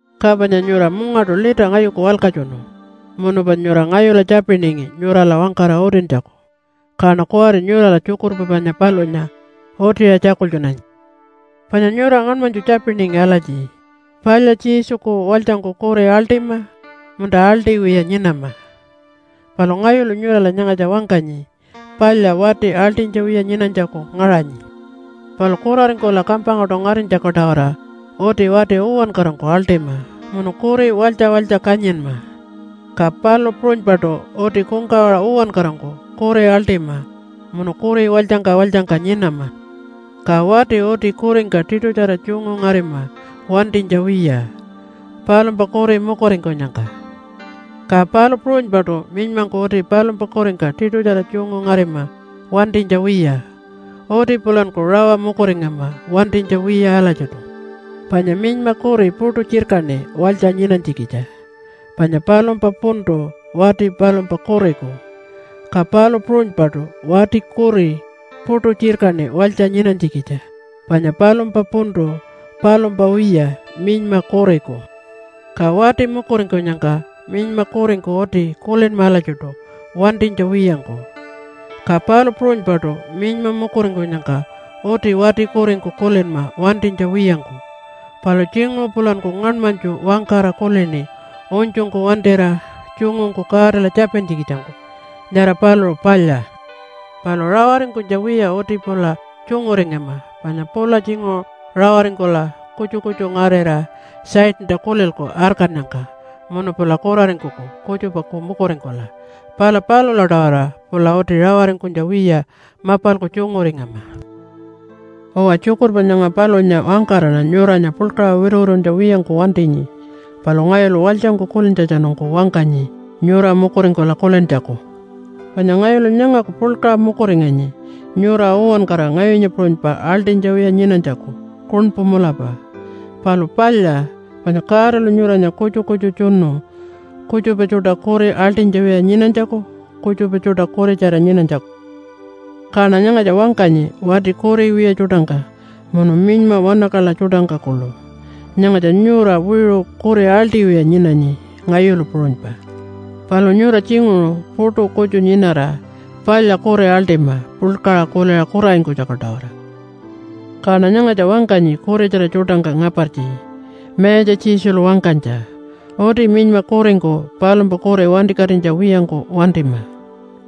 Ka panya nyura mungaṯu lita ngayuku walkatjunu munu panya nyura ngayula tjapiningi nyurala wangkara utintjaku, kaṉa kuwari nyurala tjukurpa panya palunya utiṟa tjakultjunanyi. Panya nyura ngaṉmanytju tjapiningi alatji, “Palya Jesuku walytjangku kuri aḻṯima, munta aḻṯiwiya nyinama?” Palu ngayulu nyurala nyangatja wangkanyi palya wati aḻṯinytja wiya nyinanytjaku ngaṟanyi. Palu kuraringkula kampangkaṯu ngarinytjaku-tawara uti wati uwankarangku aḻṯima munu kuri walytja walytja kanyinma. Ka palu puṟunypaṯu uti kungkawaṟa uwankarangku kuri aḻṯima munu kuri walytjangka walytjangka nyinama. Ka wati uti kuringka tiṯutjara tjungu ngarima wantinytja wiya palumpa kuri mukuringkunyangka. Ka palu puṟunypaṯu minymangku uti palumpa kuringka tiṯutjara tjungu ngarima wantinytja wiya. Uti pulanku rawa mukuringama wantinytja wiya alatjiṯu. Panya minyma kuri puṯu tjirkaṉi walytja nyinanytjikitja. Panya palumpa puntu wati palumpa kuriku. Ka palu puṟunypaṯu wati kuri puṯu tjirkaṉi walytja nyinanytjikitja. Panya palumpa puntu palumpa wiya minyma kuriku. Ka wati mukuringkunyangka minyma kuringku uti kulinma alatjiṯu wantinytja wiyangku, ka palu puṟunypaṯu minyma mukuringkunyangka uti wati kuringku kulinma wantinytja wiyangku. Palu tjinguṟu pulanku ngaṉmanytju wangkara kulini unytjungku wantira tjungungku Godala tjapintjikitjangku, nyara paluṟu palya. Palu rawaringkunytja wiya uti pula tjunguringama panya pula tjinguṟu rawaringkula kutju kutju ngarira Satanta kulilku arkannyangka munu pula kuraringkuku kutjupaku mukuringkula. Pala palula-tawara pula uti rawaringkunytja wiya mapalku tjunguringama. Uwa, tjukurpa nyanga palunya wangkaraṉa nyuranya puḻkaṟa wituwituntja wiyangku wantinyi, palu ngayulu walytjangku kulintjatjanungku wangkanyi nyura mukuringkula kulintjaku. Panya ngayulu nyangaku puḻkaṟa mukuringanyi, nyura uwankara ngayunya puṟunypa aḻṯinytja wiya nyinanytjaku kuṉpu mulapa. Palu palya, panya Godalu nyuranya kutju kutju tjunu kutjupa tjuṯa kuri aḻṯinytja wiya nyinanytjaku, kutjupa tjuṯa kuritjara nyinanytjaku. Kaṉa nyangatja wangkanyi wati kuri wiya tjuṯangka munu minyma wanakaḻa tjuṯangka kuḻu. Nyangatja nyura wiṟu kuri aḻṯiwiya nyinanyi ngayulu puṟunypa. Palu nyura tjinguṟu puṯu kutju nyinara palya kuri aḻṯima puḻkaṟa kuliṟa kuraringkunytjaku-tawara. Kaṉa nyangatja wangkanyi kuritjara tjuṯangka ngapartji Mayatja Jesulu wangkanytja, “Uti minyma kuringku palumpa kuri wantikatinytja wiyangku wantima.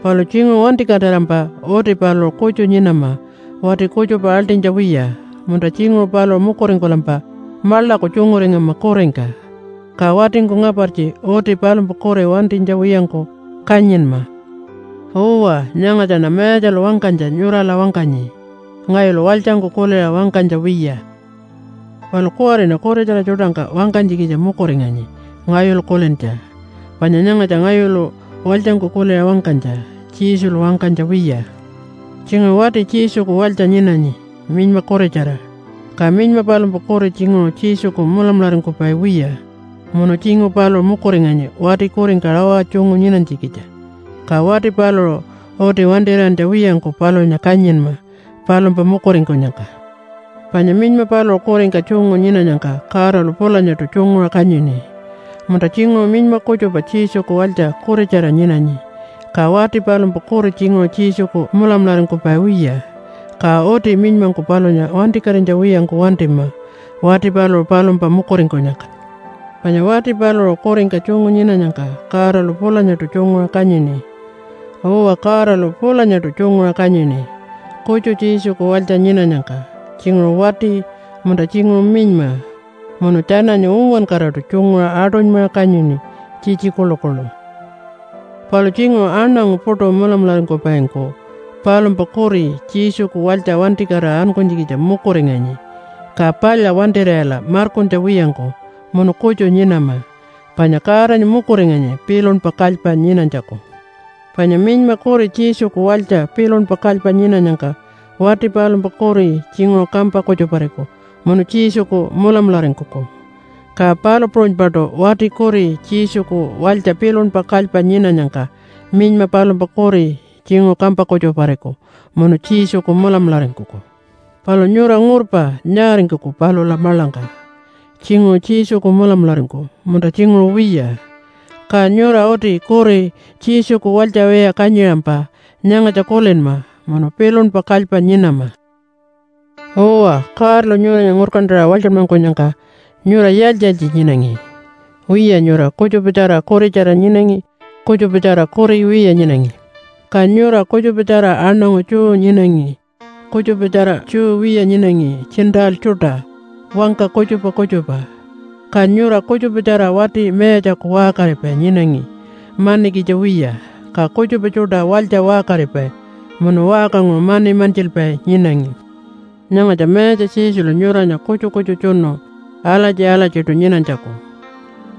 Palu tjinguṟu wantikatirampa uti paluṟu kutju nyinama wati kutjupa aḻṯinytja wiya, munta tjinguṟu paluṟu mukuringkulampa maḻaku tjunguringama kuringka. Ka watingku ngapartji uti palumpa kuri wantinytja wiyangku kanyinma.” Uwa, nyangatjaṉa Mayatjalu wangkanytja nyurala wangkanyi, ngayulu walytjangku kuliṟa wangkanytja wiya. Palu kuwariṉa kuritjara tjuṯangka wangkanytjikitja mukuringanyi ngayulu kulintja. Panya nyangatja ngayulu walytjangku kuliṟa wangkanytja, Jesulu wangkanytja wiya. Tjinguṟu wati Jesuku walytja nyinanyi minyma kuritjara, ka minyma palumpa kuri tjinguṟu Jesuku mulamularingkupai wiya, munu tjinguṟu paluṟu mukuringanyi wati kuringka rawa tjungu nyinanytjikitja. Ka wati paluṟu uti wantir'iyantja wiyangku palunya kanyinma palumpa mukuringkunyangka. Panya minyma paluṟu kuringka tjungu nyinanyangka Godalu pulanyaṯu tjunguṟa kanyini. Munta tjinguṟu minyma kutjupa Jesuku walytja kuritjara nyinanyi, ka wati palumpa kuri tjinguṟu Jesuku mulamularingkupai wiya, ka uti minymangku palunya wantikatinytja wiyangku wantima wati paluṟu palumpa mukuringkunyangka. Panya wati paluṟu kuringka tjungu nyinanyangka Godalu pulanyaṯu tjunguṟa kanyini. Uwa, Godalu pulanyaṯu tjunguṟa kanyini, kutju Jesuku walytja nyinanyangka tjinguṟu wati, munta tjinguṟu minyma. Munu tjananya uwankaraṯu tjunguṟa aṯunymaṟa kanyini tjitji kuḻukuḻu. Palu tjinguṟu aṉangu puṯu mulamularingkupaingku palumpa kuri Jesuku walytja wantikatira ankunytjikitja mukuringanyi, ka palya wantir'iyala markuntja wiyangku munu kutju nyinama. Panya Godanya mukuringanyi pilunpa kalypa nyinanytjaku. Panya minyma kuri Jesuku walytja pilunpa kalypa nyinanyangka wati palumpa kuri tjinguṟu kampa kutjupariku munu Jesuku mulamularingkuku. Ka palu puṟunypaṯu wati kuri Jesuku walytja pilunpa kalypa nyinanyangka minyma palumpa kuri tjinguṟu kampa kutjupariku munu Jesuku mulamularingkuku. Palu nyura ngurpa nyaaringkuku palula maḻangka. Tjinguṟu Jesuku mulamularingkuku munta tjinguṟu wiya. Ka nyura uti kuri Jesuku walytja wiya kanyiṟampa nyangatja kulinma munu pilunpa kalypa nyinama. Uwa, Godalu nyuranya ngurkantaṟa walytjanmankunyangka nyura yaaltji-yaaltji nyinangi? Wiya, nyura kutjupatjara kuritjara nyinangi, kutjupatjara kuri wiya nyinangi. Ka nyura kutjupatjara aṉangu Jew nyinangi, kutjupatjara Jew wiya nyinangi Gentile tjuṯa wangka kutjupa kutjupa. Ka nyura kutjupatjara wati mayatjaku waṟkaripai nyinangi manikitja wiya, ka kutjupa tjuṯa walytja waṟkaripai munu waṟkanguṟu mani mantjilpai nyinangi. Nyangatja Mayatja Jesulu nyuranya kutju kutju tjunu alatji-alatjiṯu nyinanytjaku.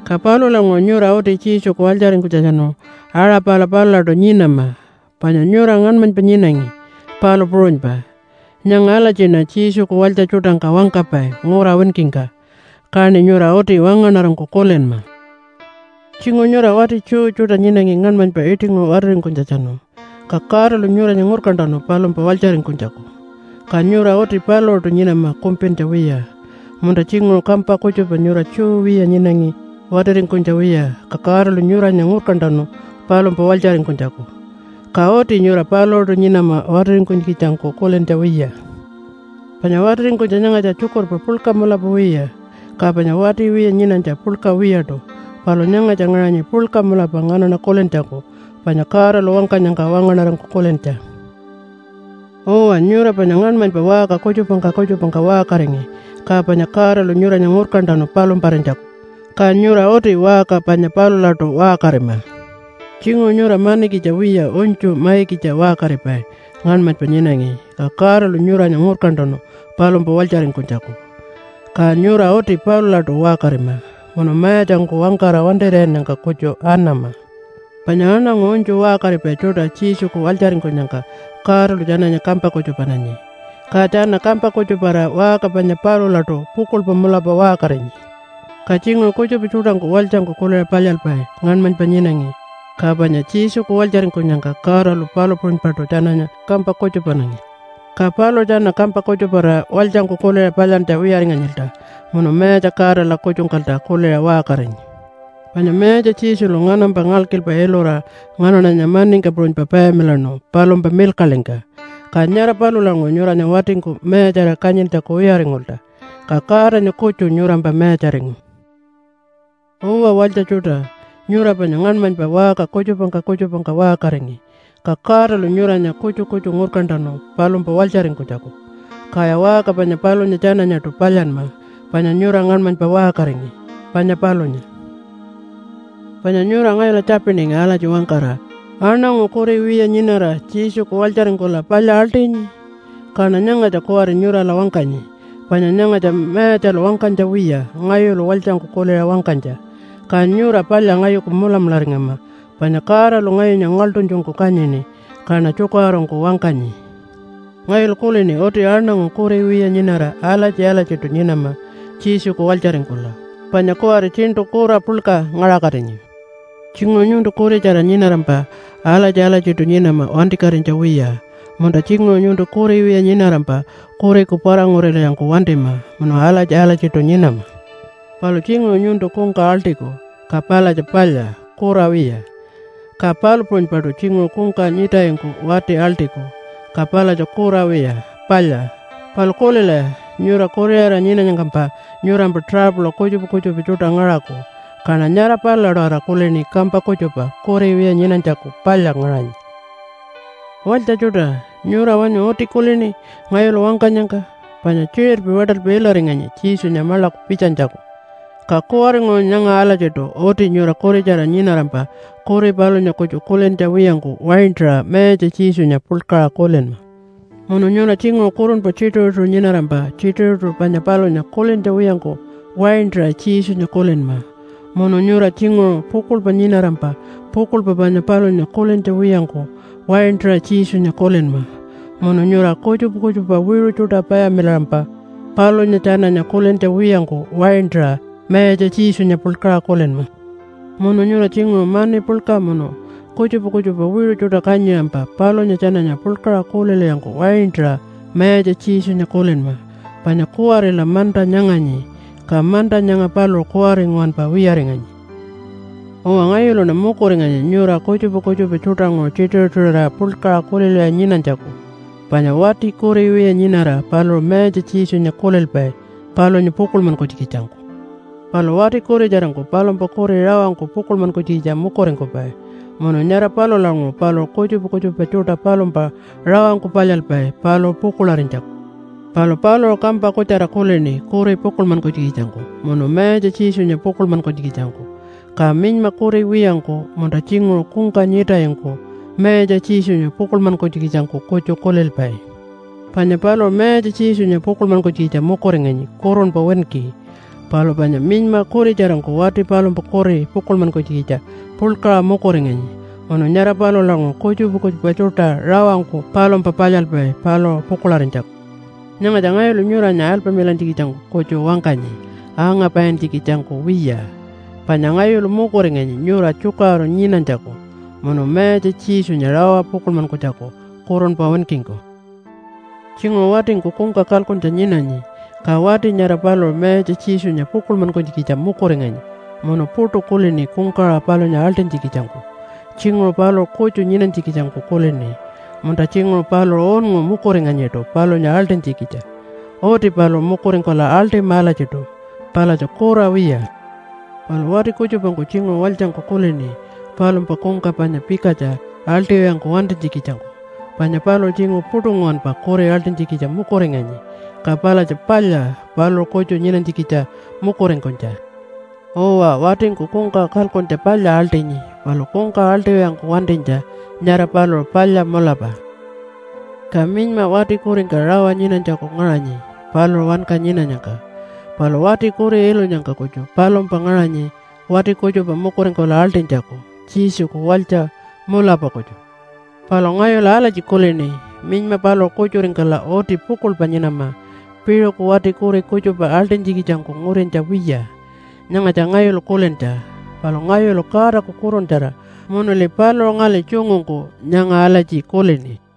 Ka palulanguṟu nyura uti Jesuku walytjaringkunytjatjanu aṟa pala palulaṯu nyinama, panya nyura ngaṉmanypa nyinangi, palu puṟunypa. Nyanga alatjiṉa Jesuku walytja tjuṯangka wangkapai ngura winkingka, kaṉi nyura uti wangaṉarangku kulinma. Tjinguṟu nyura wati Jew tjuṯa nyinangi ngaṉmanypa iṯinguṟu watiringkunytjatjanu, ka Godalu nyuranya ngurkantanu palumpa walytjaringkunytjaku. Ka nyura uti paluṟuṯu nyinama kumpintja wiya. Munta tjinguṟu kampa kutjupa nyura Jew wiya nyinangi watiringkunytja wiya, ka Godalu nyuranya ngurkantanu palumpa walytjaringkunytjaku. Ka uti nyura paluṟuṯu nyinama watiringkunytjikitjangku kulintja wiya. Panya watiringkunytja nyangatja tjukurpa puḻka mulapa wiya, ka panya wati wiya nyinanytja puḻka wiyaṯu. Palu nyangatja ngaṟanyi puḻka mulapa nganaṉa kulintjaku, panya Godalu wangkanyangka wangaṉarangku kulintja. Uwa, nyura panya ngaṉmanypa waṟka kutjupangka kutjupangka waṟkaringi, ka panya Godalu nyuranya ngurkantanu palumparinytjaku, ka nyura uti waṟka panya palulaṯu waṟkarima. Tjinguṟu nyura manikitja wiya unytju maikitja waṟkaripai ngaṉmanypa nyinangi, ka Godalu nyuranya ngurkantanu palumpa walytjaringkunytjaku. Ka nyura uti palulaṯu waṟkarima, munu mayatjangku wangkara wantir'iyannyangka kutju anama. Panya aṉangu unytju waṟkaripai tjuṯa Jesuku walytjaringkunyangka Godalu tjananya kampa kutjupananyi, ka tjana kampa kutjuparira waṟka panya palulaṯu pukuḻpa mulapa waṟkarinyi. Ka tjinguṟu kutjupa tjuṯangku walytjangku kuliṟa palyalpai ngaṉmanypa nyinangi ka panya Jesuku walytjaringkunyangka Godalu palu puṟunypaṯu tjananya kampa kutjupananyi, ka paluṟu tjana kampa kutjuparira walytjangku kuliṟa palyantja wiyaringanyilta munu Mayatja Godala kutjungkalta kuliṟa waṟkarinyi. Panya Mayatja Jesulu nganampa ngalkilpa ilura nganaṉanya maningka puṟunypa payamilaṉu palumpa milkaḻingka. Ka nyara palulanguṟu nyuranya watingku mayatjarira kanyintjaku wiyaringulta, ka Godanya kutju nyurampa mayatjaringu. Uwa walytja tjuṯa, nyura panya ngaṉmanypa waṟka kutjupangka kutjupangka waṟkaringi. Ka Godalu nyuranya kutju kutju ngurkantanu palumpa walytjaringkunytjaku. Kaya waṟka panya palunya tjananyaṯu palyanma panya nyura ngaṉmanypa waṟkaringi, panya palunya. Panya nyura ngayula tjapiningi alatji wangkara, “Aṉangu kuri wiya nyinara Jesuku walytjaringkula palya aḻṯinyi?” Kaṉa nyangatja kuwari nyurala wangkanyi. Panya nyangatja Mayatjalu wangkanytja wiya, ngayulu walytjangku kuliṟa wangkanytja. Ka nyura palya ngayuku mulamularingama, panya Godalu ngayunya ngaḻṯunytjungku kanyini kaṉa tjukaṟurungku wangkanyi. Ngayulu kulini uti aṉangu kuri wiya nyinara alatji-alatjiṯu nyinama Jesuku walytjaringkula. Panya kuwari tjiṉṯu kura puḻka ngaṟakatinyi. Tjinguṟu nyuntu kuritjara nyinarampa alatji-alatjiṯu nyinama wantikatinytja wiya. Munta tjinguṟu nyuntu kuri wiya nyinarampa kuriku para-ngurilwiyangku wantima munu alatji-alatjiṯu nyinama. Palu tjinguṟu nyuntu kungka aḻṯiku, ka palatja palya, kura wiya. Ka palu puṟunypaṯu tjinguṟu kungka nyiṯayingku wati aḻṯiku, ka palatja kura wiya, palya. Palu kulilaya, nyura kuriṟara nyinanyangkampa nyurampa tuṟapula kutjupa kutjupa tjuṯa ngaṟaku. Kaṉa nyara palula-tawara kulini kampa kutjupa kuri wiya nyinanytjaku palya ngaṟanyi. Walytja tjuṯa, nyura wanyu uti kulini ngayulu wangkanyangka? Panya tjiṟirpi waṯalpi ilaringanyi Jesunya maḻaku pitjanytjaku, ka kuwaringuṟu nyanga alatjiṯu uti nyura kuritjara nyinarampa kuri palunya kutju kulintja wiyangku waintaṟa Mayatja Jesunya puḻkaṟa kulinma. Munu nyura tjinguṟu kurunpa tjituṟu-tjituṟu nyinarampa tjituṟu-tjituṟu panya palunya kulintja wiyangku waintaṟa Jesunya kulinma. Munu nyura tjinguṟu pukuḻpa nyinarampa pukuḻpa panya palunya kulintja wiyangku waintaṟa Jesunya kulinma. Munu nyura kutjupa kutjupa wiṟu tjuṯa payamilaṟampa palunya tjananya kulintja wiyangku waintaṟa Mayatja Jesunya puḻkaṟa kulinma. Munu nyura tjinguṟu mani puḻka munu kutjupa kutjupa wiṟu tjuṯa kanyiṟampa palunya tjananya puḻkaṟa kulilwiyangku waintaṟa Mayatja Jesunya kulinma. Panya kuwarila manta nyanganyi, ka manta nyanga paluṟu kuwari nguwanpa wiyaringanyi. Uwa, ngayuluṉa mukuringanyi nyura kutjupa kutjupa tjuṯanguṟu tjituṟu-tjituṟurira puḻkaṟa kulilwiya nyinanytjaku. Panya wati kuri wiya nyinara paluṟu Mayatja Jesunya kulilpai palunya pukuḻmankunytjikitjangku. Palu wati kuritjarangku palumpa kuri rawangku pukuḻmankunytjikitja mukuringkupai munu nyara palulanguṟu paluṟu kutjupa kutjupa tjuṯa palumpa rawangku palyalpai paluṟu pukuḻarinytjaku. Palu paluṟu kampa kutjara kulini kuri pukuḻmankunytjikitjangku munu Mayatja Jesunya pukuḻmankunytjikitjangku. Ka minyma kuri wiyangku munta tjinguṟu kungka nyiṯayingku Mayatja Jesunya pukuḻmankunytjikitjangku kutju kulilpai. Panya paluṟu Mayatja Jesunya pukuḻmankunytjikitja mukuringanyi kurunpa winki. Palu panya minyma kuritjarangku wati palumpa kuri pukuḻmankunytjikitja puḻkaṟa mukuringanyi munu nyara palulanguṟu kutjupa kutjupa tjuṯa rawangku palumpa palyalpai paluṟu pukuḻarinytjaku. Nyangatja ngayulu nyuranya alpamilantjikitjangku kutju wangkanyi, angapaintjikitjangku wiya, panya ngayulu mukuringanyi nyura tjukaṟuru nyinanytjaku, munu Mayatja Jesunya rawa pukuḻmankunytjaku kurunpa winkingku. Tjinguṟu watingku kungka kalkuntja nyinanyi. Ka wati nyara paluṟu Mayatja Jesunya pukuḻmankunytjikitja mukuringanyi munu puṯu kulini kungkawaṟa palunya aḻṯinytjikitjangku. Tjinguṟu paluṟu kutju nyinanytjikitjangku kulini, munta tjinguṟu paluṟu unngu mukuringanyiṯu palunya aḻṯinytjikitja. Uti paluṟu mukuringkula aḻṯima alatjiṯu. Palatja kura wiya. Palu wati kutjupangku tjinguṟu walytjangku kulini palumpa kungka panya pikatja aḻṯiwiyangku wantinytjikitjangku, panya paluṟu tjinguṟu puṯu nguwanpa kuri aḻṯinytjikitja mukuringanyi. Ka palatja palya paluṟu kutju nyinanytjikitja mukuringkunytja. Uwa, watingku kungka kalkuntja palya aḻṯinyi. Palu kungka aḻṯiwiyangku wantinytja, nyara paluṟu palya mulapa. Ka minyma wati kuringka rawa nyinanytjaku ngaṟanyi paluṟu wanka nyinanyangka. Palu wati kuri ilunyangka kutju palumpa ngaṟanyi wati kutjupa mukuringkula aḻṯinytjaku Jesuku walytja mulapa kutju. Palu ngayulu alatji kulini, minyma paluṟu kutjuringkula uti pukuḻpa nyinama piṟuku wati kuri kutjupa aḻṯinytjikitjangku ngurintja wiya. Nyangatja ngayulu kulintja, palu ngayulu Godaku Kuruntjara munuli paluṟu ngali tjungungku nyanga alatji kulini.